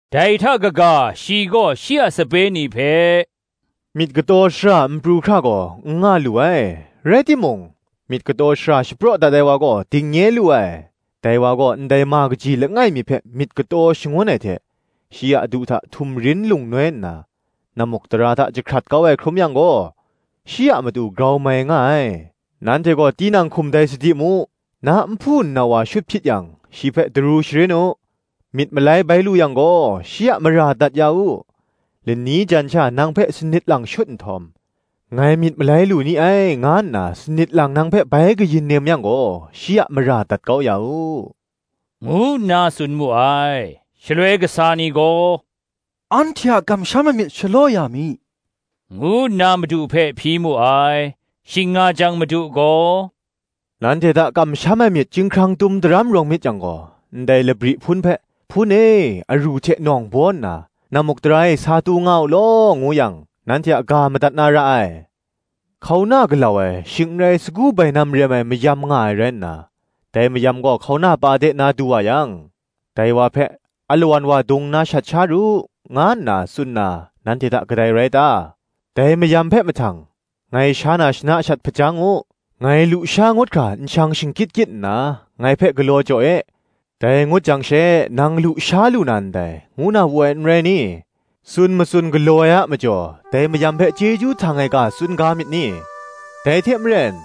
Dai hta kaga shi gaw shi a sape ni hpe, Myit kataw shara n pru hkra gaw n nga lu ai: rai timung, myit kataw shara shapraw dat ai wa gaw, dingnye lu ai. Dai wa gaw, ndai ma kaji langai mi hpe myit kataw shangun ai hte, shi a du hta htumrin lung noi nna, nammukdara hta jahkrat kau ai hkrum yang gaw, shi a matu grau mai nga ai. Nanhte gaw tinang hkum dai sadi mu: na nhpu nnau wa shut hpyit yang, shi hpe daru sharin u: myit malai bai lu yang gaw, shi a mara dat ya u: lani jan sha nang hpe sanit lang shut nhtawm, “Ngai myit malai lu ni ai, nga nna sanit lang nang hpe bai kayin nem yang gaw, shi a mara dat kau ya u,” ngu nna tsun mu ai. Shaloi kasa ni gaw, “Anhte a kamsham ai myit shalaw ya mi,” ngu nna Madu hpe hpyi mu ai. Shing nga jang Madu gaw, “nanhte hta kamsham ai myit chyinghkrang tum daram rawng myit yang gaw, ndai labri hpun hpe, ‘Hpun e, aru hte nawng baw nna nammukdara e sa tu nga u law,’ ngu yang, nanhte a ga madat na ra ai. “Hkauna galau ai, shing n rai sagu bainam rem ai mayam nga ai rai nna, dai mayam gaw hkauna pa de na du wa yang, dai wa hpe, ‘Alawan wa dung nna shat sha ru,’ nga nna tsun na, nanhte hta kadai rai ta? Dai mayam hpe mahtang, ‘Ngai sha na shana shat hpajang u; ngai lu sha ngut hkra nshang shingkyit kyit nna, ngai hpe galaw jaw e; dai ngut jang she nang lu sha lu na ndai,’ ngu na wu ai, n rai ni? Tsun matsun galaw ai a majaw, dai mayam hpe chyeju htang ai ga tsun ga myit ni? Dai hte maren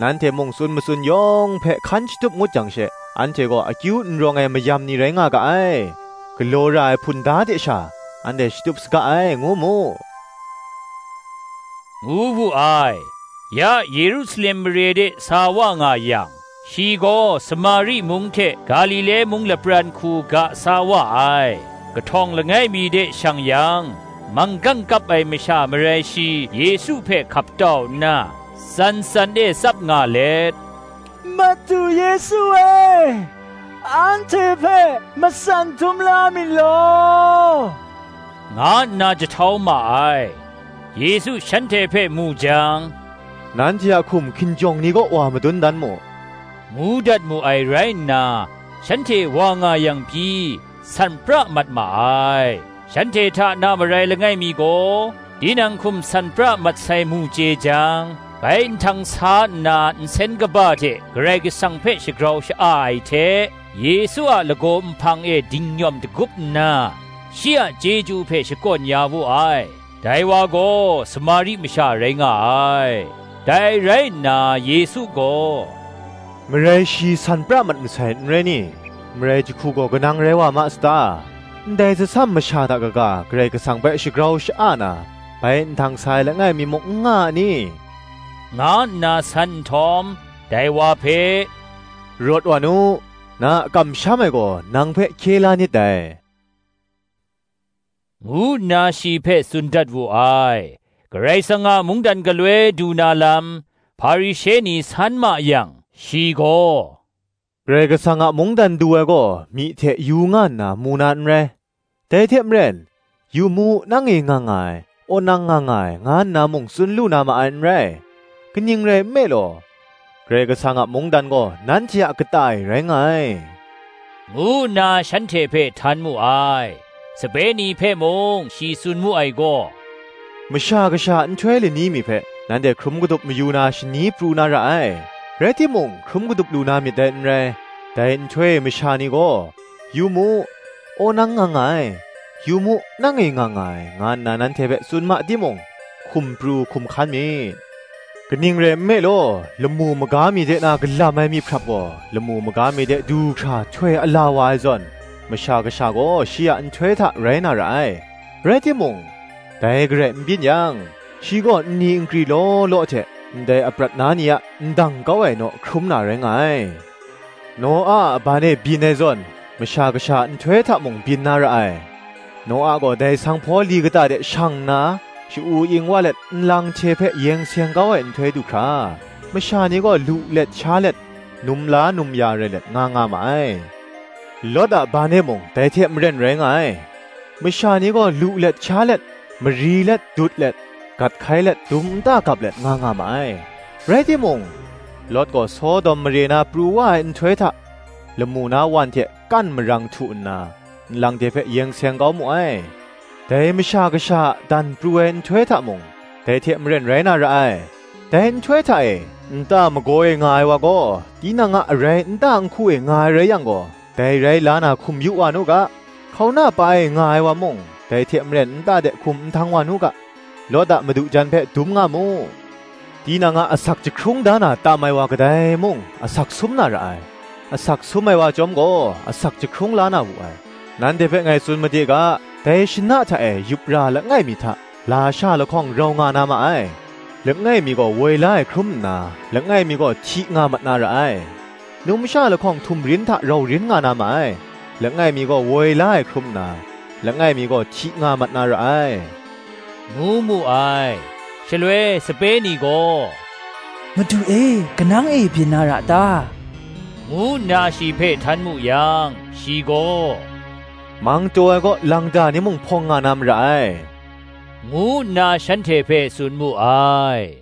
nanhte mung tsun matsun yawng hpe hkan shatup ngut jang she, ‘Anhte gaw akyu n rawng ai mayam ni rai nga ga ai; galaw ra ai hpunda hte sha anhte shatup saga ai,’ ngu mu,” ngu wu ai. Ya Yerusalem mare de sa wa nga yang, shi gaw Samari mung hte Galile mung lapran hku ga sa wa ai. Kahtawng langai mi de shang yang, manggang kap ai masha marai shi Yesu hpe hkap tau nna, tsan tsan e tsap nga let, “Madu, Yesu e, anhte hpe matsan dum la mi law,” nga nna jahtau ma ai. Yesu shanhte hpe mu jang, “Nanhte a hkum hkinjawng ni kaw wa madun dan mu,” ngu dat mu ai rai nna, shanhte wa nga yang pyi, san pra mat ma ai. Shanhte hta na marai langai mi gaw, tinang hkum san pra mat sai mu chye jang, bai nhtang sa nna nsen kaba hte Karai Kasang hpe shagrau sha-a ai hte, Yesu a lagaw nhpang e dingnyawm dagup nna, shi a chyeju hpe shakawn ya wu ai: dai wa gaw Samari masha rai nga ai. Dai rai nna Yesu gaw, “Marai shi san pra mat masai, n rai ni? marai jahku gaw kanang rai wa ma sata? Ndai tsasam masha hta kaga, Karai Kasang hpe shagrau sha-a na, bai nhtang sa ai langai mi muk n nga a ni?” nga nna san nhtawm, dai wa hpe, “Rawt wa nu; na a kamsham ai gaw nang hpe hkye la nit dai,” ngu nna shi hpe tsun dat wu ai. Karai Kasang a mungdan galoi du na lam, Hparishe ni san ma yang, shi gaw, “Karai Kasang a mungdan du ai gaw myi hte yu nga nna, mu na n rai; dai hte maren, ‘Yu mu, nang e nga nga ai, wonang nga nga ai, nga nna mung tsun lu na ma ai, n rai:’ kaning rai nme law, Karai Kasang a mungdan gaw, nanhte a kata e rai nga ai,” ngu nna shanhte hpe htan mu ai. Sape ni hpe mung shi tsun mu ai gaw, “Masha Kasha a nhtoi lani mi hpe nanhte hkrum kadup mayu na shani pru na ra ai, rai timung hkrum kadup lu na myit dai n rai: dai nhtoi e masha ni gaw, ‘Yu mu, wonang nga nga ai,’ ‘Yu mu, nang e nga nga ai,’ nga nna nanhte hpe tsun ma timung, hkum pru, hkum hkan myit: kaning rai nme law, lamu maga mi de na kalam ai myihprap gaw, lamu maga mi de du hkra htoi ala wa ai zawn, Masha Kasha gaw shi a nhtoi hta rai na ra ai. Rai timung, dai garai n byin yang, shi gaw nni nkri law law hte, ndai aprat na ni a ndang kau ai, naw hkrum na rai nga ai. Noa a ban e byin ai zawn, Masha Kasha a nhtoi hta mung byin na ra ai. Noa gaw dai sanghpaw li kata de shang nna, sha-u ing wa let nlang hte hpe yeng seng kau ai nhtoi du hkra, masha ni gaw lu let sha let num la num ya rai let, nga nga ma ai. Lawt a ban hta e mung dai hte maren rai nga ai: masha ni gaw lu let sha let, mari let dut let, gat hkai let, dum nta gap let nga nga ma ai: rai timung, Lawt gaw Sodom mare na pru wa ai nhtoi hta, lamu na wan hte kan marang htu nna, nlang hte hpe yeng seng kau mu ai: dai Masha Kasha a dan pru ai nhtoi hta mung, dai hte maren rai na ra ai. Dai nhtoi hta e, nta magaw e nga ai wa gaw, tinang a arai nta nhku e nga ai rai yang gaw, dai rai la na hkum yu wa nu ga: hkauna pa e nga ai wa mung, dai hte maren nta de hkum nhtang wa nu ga. Lawt a madu jan hpe dum nga mu. Tinang a asak jahkrung da na tam ai wa kadai mung, asak sum na ra ai; asak sum ai wa chyawm gaw, asak jahkrung la na wu ai. Nanhte hpe ngai tsun made ga, “Dai shana hta e yup ra langai mi hta, lasha lahkawng rau nga na ma ai; langai mi gaw woi la ai hkrum nna, langai mi gaw hti nga mat na ra ai. Numsha lahkawng htumrin hta rau rin nga na ma ai; langai mi gaw woi la ai hkrum nna, langai mi gaw hti nga mat na ra ai,” ngu mu ai. Shaloi sape ni gaw, “Madu e, kanang e byin na ra ta?” ngu nna shi hpe htan mu yang, shi gaw, “Mang taw ai kaw, lang da ni mung hpawng nga na mara ai,” ngu nna shanhte hpe tsun mu ai.